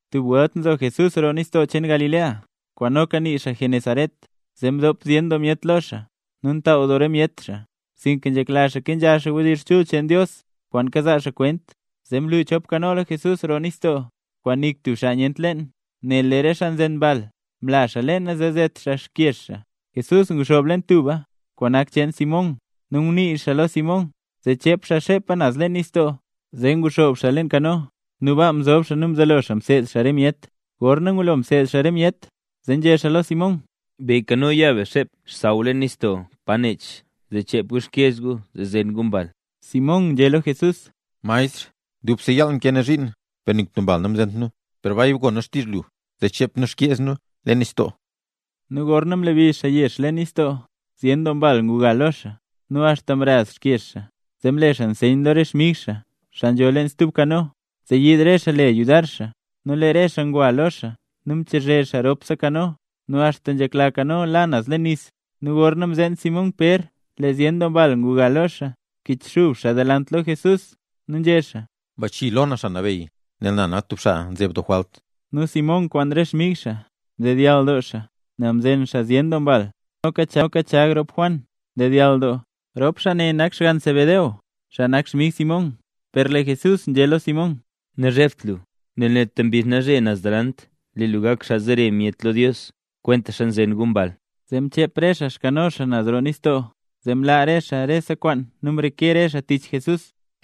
Tub welt Jesús nzo roo nistoo cheen Galilea, kwaan noka nii xaa Genesaret, zee mdop zyen doo myet lo xaa nu ntaaw doo re myet xaa, sinka nzhekla xaa kenzha xaa wdizh chul cheen Dios kwaan kazaa xaa kwent. Zee mlu chop kano lo Jesús roo nistoo, kwaan nik tub xaa nyent leen, nel lee re xaa nzen mbal mla xaa leena zee zet xaa xkyeez xaa. Jesús nguxoob leen tuba, kwaan nak cheen Simón, nu ngunii xaa lo Simón zee chep xaa xepa naz leen nistoo. Zee nguxoob xaa leen kano, nu baa mzob xaa nu mzelo xaa mseed xaa re myet. Gorna ngulo mseed xaa re myet, zee nzhé xaa lo Simón: —Be kano, ya be xep xsaww leen nistoo paro nech, zee bchep gu xkyeez gu zee zen gu mbal. Simón nzhé lo Jesús: —Maestr, dubse yaal mkee nu zhiin per nik tub mbal namzent nu; per bay gon nu xtizh lu zee ya be zee chep nu xkyeez nu leen nistoo. Nu gorna mlebi xaa yeez leen nistoo zyen doo mbal nguga lo xaa, nu axta mraz xkyeez xaa. Zee mle xaa nseyn lo re xmig xaa, xaa nzho leen stub kano, zee yiid re xaa le xaa yudar xaa. Nu lee re xaa ngwa lo xaa nu mchazhe re xaa ropse kano axta nzhekla kano la naz leen nis. Nu gorna mzeen Simón Pér lee zyen doo mbal nguga lo xaa, mkichxub xaa delant lo Jesús nu nzhé xaa: —¡Bachii lo na, Xaa Nabeyy, nel na nak tub xaa nzeb doo jwalt! Nu Simón kwaan re xmig xaa mdedyall doo nel mzen xaa zyen doo mbal. Nu noka Chag rop Juan mdedyall doo, rop xaa ne nak xgann Zebedeo, nu ngok xmig Simón. Per lee Jesús nzhé lo Simón: —Nazhebt lu, nel neta mbizh nalzhe naz delant lee lu gak xaa zere myet lo Dios kwentaxa nzen gu mbal. Zee mchep re xaa xkano xaa naz roo nistoo zee mlaa re xaa rese kwaan nu mreke re xaa tich Jesús.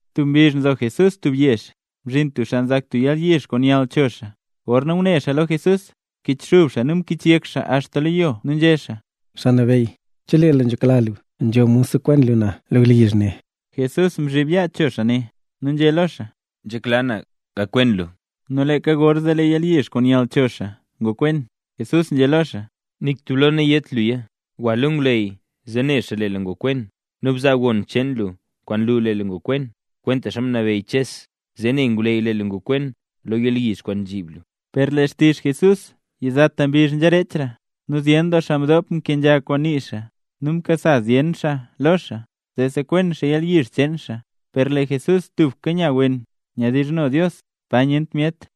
Tub mbizh nzo Jesús tub yezh, mzhin tub xaa nzak tub yalyizh kwaan nyall cho xaa. Gorna ngune xaa lo Jesús, mkichxub xaa nu mkichyek xaa axta lo yo nu nzhé xaa: —Xaa Nabeyy, chelee lu nzhekla lu, nzho mod sekwen lu na lo yalyizh ne. Jesús mzhib yaa cho xaa, nu nzhé lo xaa: —Nzhekla na; gakwen lu. Nu leeka gorzee lee yalyizh kwaan nyall cho xaa ngokwen. Jesús nzhé lo xaa: —Nik tub lo nayét luya. Gwa lo ngwleyy zee ne xaa lee lu ngokwen, nu bzaa gon cheen lu kwaan nlu lee lu ngokwen, kwentaxa mnabeyy Ches, zee ne ngwleyy lee lu ngokwen lo yalyizh kwaan mzhib lu. Per lee xtizh Jesús yizata mbizh nzharechra, nu zyen doo xaa mdop mkenzha kwaan nii xaa, nu mkasa zyen xaa lo xaa zee sekwen xaa yalyizh cheen xaa. Per lee Jesús tubka nya wen nyawdizhno Dios, pa nyent myet.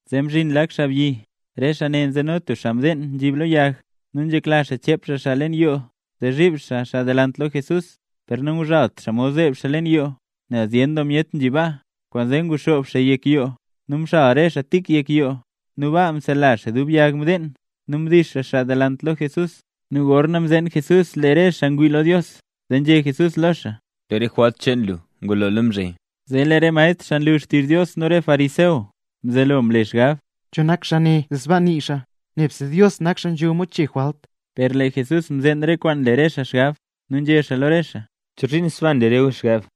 Zee mzhin lak xaabyi, re xaa ne nzeno tub xaa mdeen nzhib lo yag, nu nzhekla xaa chep xaa xaa leen yoo zee zhiib xaa xaa delant lo Jesús. Per nanguzhalt xaa mod zeeb xaa leen yoo, nel zyen doo myet nzhi baa; kwaanzee nguxoob xaa yek yoo, nu mxal re xaa tik yek yoo, nu baa msela xaa dub yag mdeen, nu mdix xaa xaa delant lo Jesús. Nu gorna mzeen Jesús re xaa ngwii lo Dios, zee nzhé Jesús lo xaa: —Lee re jwalt cheen lu ngulola mzhe. Zee lee re maestr xaa nlu xtizh Dios nu re fariseo nzelo mle xaa xgab: “¿Cho nak xaabyi ne, zee sbaa nii xaa? Nebse Dios nak xaa nzho mod chee re jwalt.” Per lee Jesús mzeen re kwaan nle re xaa xgab, nu nzhé xaa lo re xaa: —¿Chozhiin sbaa nle re gu xgab?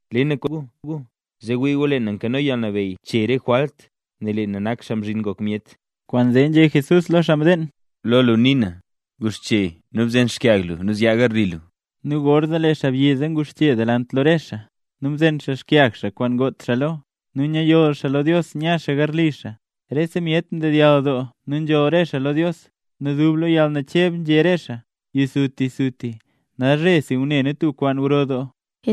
Le na kwaane lo gu, zee wii gu lee na nkano yalnabeyy chee na re jwalt, nel lee na nak Xaa Mzhin Ngok Myet. Kwaanzee nzhé Jesús lo xaa mdeen: —Guxche nu bzen xkyag lu nu zyaa garli lu. Nu gorzee lee xaabyi zee nguxche delant lo re xaa, nu mzen xaa xkyag xaa kwaan ngot xaa lo, nu nyayoll xaa lo Dios nya xaa garli xaa. Rese myet mdedyall doo nu nzholl re xaa lo Dios, nu dub lo yalnacheb nzhé re xaa: —¡Yisutisuti, nalzhe si ngune nu tub kwaan gro doo!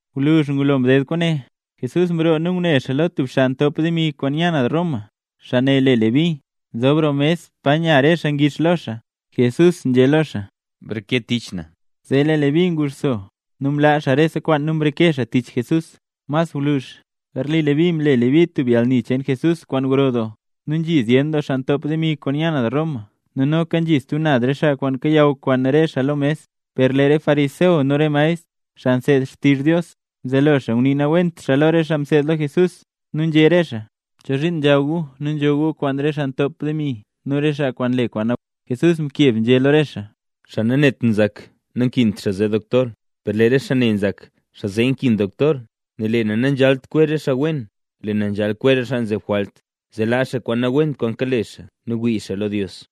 Gwluzh ngulo mded kwaane, Jesús mroo nu ngune xaa lo tub xaa ntop demi kwaan nya naz Roma, xaa ne le Leví, nzob roo mes pa nya re xaa ngix lo xaa. Jesús nzhé lo xaa: —Breke tich na. Zee lee Leví nguxso, nu mlaa xaa rese kwaan nu mreke xaa tich Jesús. Mas gwluzh, garli Leví mle Leví tub yalni cheen Jesús kwaan gro doo; nu nzhi zyen doo xaa ntop demi kwaan nya naz Roma nu noka nzhi stub naz re xaa kwaan kayaw kwaan re xaa lo mes. Per lee re xaa fariseo nu re maestr, xaa nseed xtizh Dios, mzelo xaa ngunii nawent lo re xaa mseed lo Jesús, nu nzhé re xaa: —¿Chozhiin nzhaw gu nu nzho gu kwaan re xaa ntop demi nu re xaa kwaan nle kwaan nawent? Jesús mkeb nzhé lo re xaa: —Xaa nanet nzak, nankint xaa zee doktor, per lee re xaa ne nzak, xaa zee nkin doktor. Nel lee na nanzhalt kwezh re xaa wen, lee na nzhal kwezh re xaa nzeb jwalt, zee laa xaa kwaan nawent kwaan kale xaa nu wii xaa lo Dios.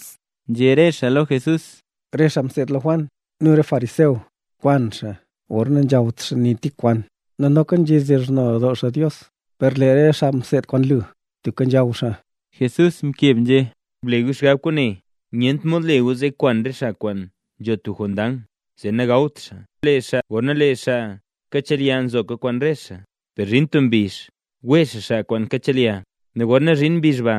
Nzhé re xaa lo Jesús: —Lee re xaa mseed lo Juan nu re fariseo zyen doo welt nkwan xaa gorna nazhawt xaa nik tik kwaan nu noka nzhedizhno doo xaa Dios, per lee re xaa mseed kwaan lu tubka nzhaw xaa nu nzho xaa. Jesús mkeb nzhé: —Ble gu xgab kwaane. Nyent mod le gu zee kwan re xaa kwaan nzho tub jondang, zee nagawt xaa, gorna lee xaa kachelya nzoka kwaan re xaa. Per zhin tub mbizh wee xaa xaa kwaan kachelya; nu gorna zhin mbizh ba,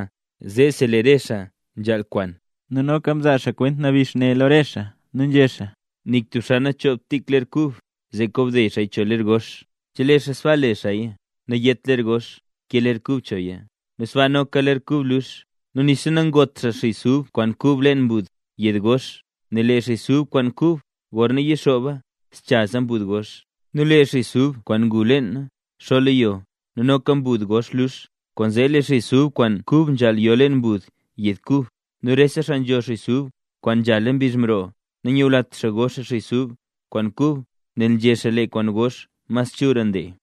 zeesi lee re xaa nzhaal kwan. Nu noka mzaa xaa kwent nabix ne lo re xaa nu nzhé xaa: —Nik tub xaa nanchoogt tik ler kub, zee kobde xaaya cho ler gox. Chelee xaa sbaa le xaaya, nayet ler gox kee ler kub choya, nu sbaa noka ler kub lux. Nu nixa nangot xaa xis ub kwaan kub leen mbud yed gox. Nel lee xis ub kwaan kub gorna yixooba zchaza mbud gox. Nu lee xis ub kwaan ngu leena xo lo yo, nu noka mbud gox lux. Kwaanzee lee xis ub kwaan kub nzhaal yo leen mbud yed kub. Nu rese xaa nzho xis ub kwaan nzhala mbizh mroo, nanyulat xaa go xaa xis ub kwaan kub, nel nzhé xaa: “Lee kwaan gox mas chulra ndee”.